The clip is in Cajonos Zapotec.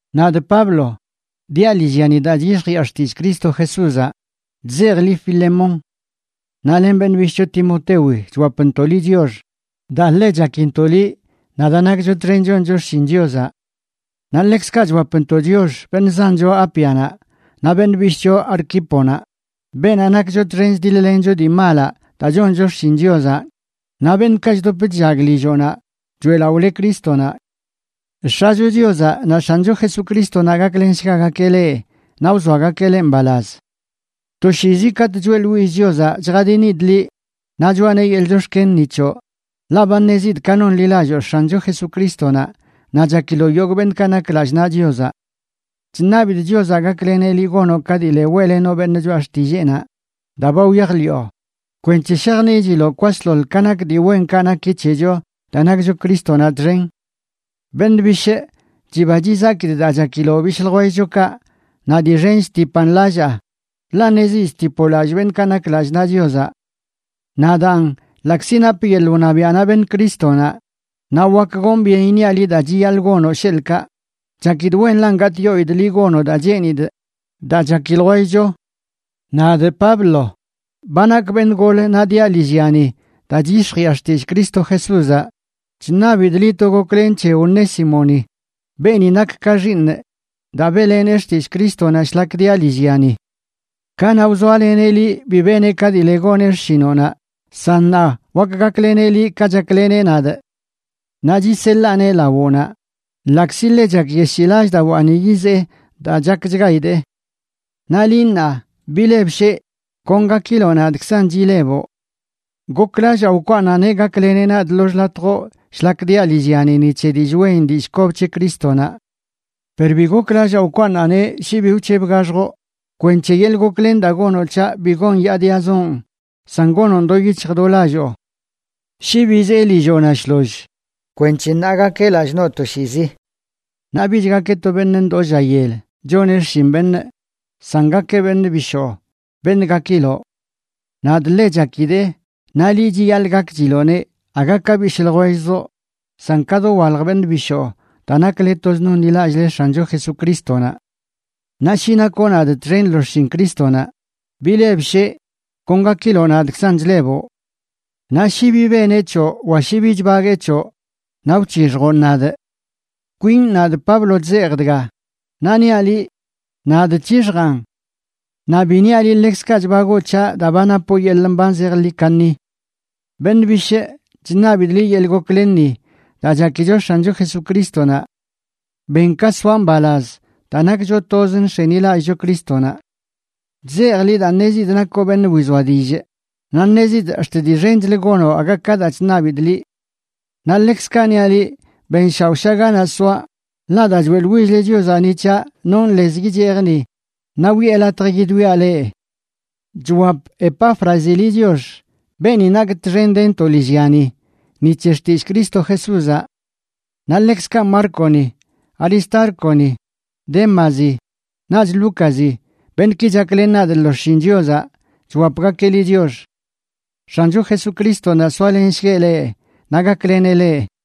Nadꞌ Pablo, diaꞌ lillyani daa chyix̱jiꞌa xtillꞌ Cristo Jesúzaꞌ, chzejꞌ liꞌ Filemón. Naꞌ len beṉꞌ bishꞌcho Timotewi chwapntoꞌ liꞌ chiox, daa ḻe chakintoꞌ liꞌ, naꞌ daa nakcho txen choncho xshin Chiozaꞌ. Naꞌ ḻekzkaꞌ chwapntoꞌ chiox beṉꞌ zancho Ápianaꞌ, naꞌ beṉꞌ bishꞌcho Arquíponaꞌ, beenaꞌ nakcho txen chdiḻ-lencho dii malaꞌ daa choncho xshin Chiozaꞌ, naꞌ beṉꞌkaꞌ chdop chllag lilloꞌnaꞌ choeꞌlaꞌole Crístonaꞌ. X̱acho Chiozaꞌ naꞌ X̱ancho Jesucrístonaꞌ gaklenshgagakeꞌ leꞌ naꞌ wzoagakeꞌ leꞌ mbalaz. Toshiizi katꞌ choeꞌḻwillꞌ Chiozaꞌ chjadinidꞌ liꞌ naꞌ choꞌaneꞌ yeḻꞌ chox̱ken ni c̱hoꞌ, ḻaꞌ ba ṉezidꞌ ka nonḻilalloo X̱ancho Jesucrístonaꞌ naꞌ chakiloꞌ yogꞌ beṉꞌkaꞌ nak lallꞌ naꞌ Chiozaꞌ. Chṉabidꞌ Chiozaꞌ gakleneꞌ liꞌ gonoꞌ ka dii le weꞌlenoꞌ beṉꞌ choꞌa xtilleenaꞌ daa ba wyajḻiꞌo kwenc̱he shajniꞌchiloꞌ kwasḻoḻ ka nak dii wenkaꞌ naki c̱hecho daa nakcho Crístonaꞌ txen. Beṉꞌ bishꞌ, chiba chizakidꞌ daa chakiloꞌ bishꞌ ljwelloꞌkaꞌ, naꞌ dii xen chtipan lallaa, ḻaꞌ ṉezidꞌ chtipoꞌ lallꞌ beṉꞌkaꞌ nak lallꞌ naꞌ Chiozaꞌ. Naꞌ daan, ḻaꞌkzi napꞌ yeḻꞌ wṉabiaꞌnaꞌ beṉ Crístonaꞌ, naꞌ wak gonꞌ byen iṉiaꞌ liꞌ daa chiyaḻꞌ gonoꞌ, sheḻꞌkaꞌ, chakidꞌ wenlan gatꞌyoidꞌ liꞌ gonoꞌ daa cheenidꞌ daa chaki ljwellcho. Nadꞌ Pablo ba nakꞌ beṉꞌ gol naꞌ diaꞌ lillyani daa chyix̱jiꞌa xtillꞌ Cristo Jesúzaꞌ, chṉabidꞌ liꞌ to goklen c̱he Onésimoni, beeni nak ka xiiṉꞌ daa beꞌlenee xtillꞌ Crístonaꞌ shlak diaꞌ lillyani. Kanaꞌ wzoaleneꞌ liꞌ bi beneꞌ ka dii le goneꞌ xshinoꞌnaꞌ, san ṉaa wak gakleneꞌ liꞌ ka chakleneꞌ nadꞌ. Naꞌ chiseḻaaneꞌ lawoꞌnaꞌ, ḻaꞌkzi ḻe chakyeshii lallꞌdawaani yizee daa chakchgaidee. Naꞌ liꞌ ṉaa, bilebsheꞌ, kon gakiloꞌ nadꞌkzanꞌ chileboꞌ. Goklallaa wkwaaṉaꞌneꞌ gakleneꞌ nadꞌ lo xḻatjoꞌ shlak diaꞌ lillyani ni c̱he dillꞌ wen dillꞌ kob c̱he Crístonaꞌ. Per bi goklallaa wkwaaṉaꞌneꞌ shi bi wc̱hebgaxjoꞌ, kwenc̱he yeḻꞌ goklen daa gonoꞌ c̱haꞌ bi gonyaadiazoꞌn, san gonoꞌn do yic̱hj do lalloo. Shi bizee lilloꞌnaꞌ shloll kwenc̱he ṉaa gakeꞌ lallꞌ noꞌ toshiizi. Naꞌ bich gakeꞌ to beṉꞌ ndoo lla yel choneꞌ xshin beṉꞌ san gakeꞌ beṉꞌ bishoo, beṉꞌ gakiloꞌ. Nadꞌ ḻe chakidee, naꞌ liꞌ chiyaḻꞌ gakchiloꞌneꞌ aga ka bishꞌ ljwellzoꞌ, san ka dowalj beṉꞌ bishoo daa nakle toz nonḻilallꞌle X̱ancho Jesucrístonaꞌ. Naꞌ shi nakoꞌ nadꞌ txen lo xshin Crístonaꞌ, bilebsheꞌ, kon gakiloꞌ nadꞌkzan chleboꞌ. Naꞌ shi bi beneꞌ c̱hoꞌ wa shi bi chbaguee c̱hoꞌ, naꞌ wc̱hixjoꞌn nadꞌ. Kwin nadꞌ, Pablo chzejꞌ dga, naꞌ niaꞌ liꞌ: Nadꞌ c̱hixjaan. Naꞌ bi niaꞌ liꞌ ḻekzkaꞌ chbagoo c̱haꞌ daa ba napoꞌ yeḻꞌ mban zejḻi kaṉi. Beṉꞌ bishꞌ, chṉabidꞌ liꞌ yeḻꞌ goklenni daa chakicho X̱ancho Jesucrístonaꞌ. Ben ka soaꞌ mbalaz daa nakcho toz nx̱enilallꞌcho Crístonaꞌ. Chzejꞌ liꞌ daa ṉezidꞌ nakoꞌ beṉꞌ wizoa dillꞌ, naꞌ ṉezidꞌ ax̱t dii xenchlə gonoꞌ aga ka daa chṉabidꞌ liꞌ. Naꞌ ḻekzkaꞌ niaꞌ liꞌ, benshaoꞌsha ganaꞌ soaꞌ, ḻaꞌ daa choeꞌḻwill-le Chiozaꞌ ni c̱haꞌ, nonꞌ lez yichejꞌ ni naꞌ wiꞌe latj yidwiaꞌ leꞌ. Chwap Epáfrazi liꞌ chiox, beeni nakꞌ txen dentoꞌ lillyani ni c̱he xtillꞌ Cristo Jesúzaꞌ. Naꞌ ḻekzkaꞌ Márconi, Aristárconi, Démazi, naꞌch Lúcazi, beṉꞌki chaklen nadꞌ lo xshin Chiozaꞌ, chwapgakeꞌ liꞌ chiox. X̱ancho Jesucrístonaꞌ soalenshgueꞌ leꞌ naꞌ gakleneꞌ leꞌ.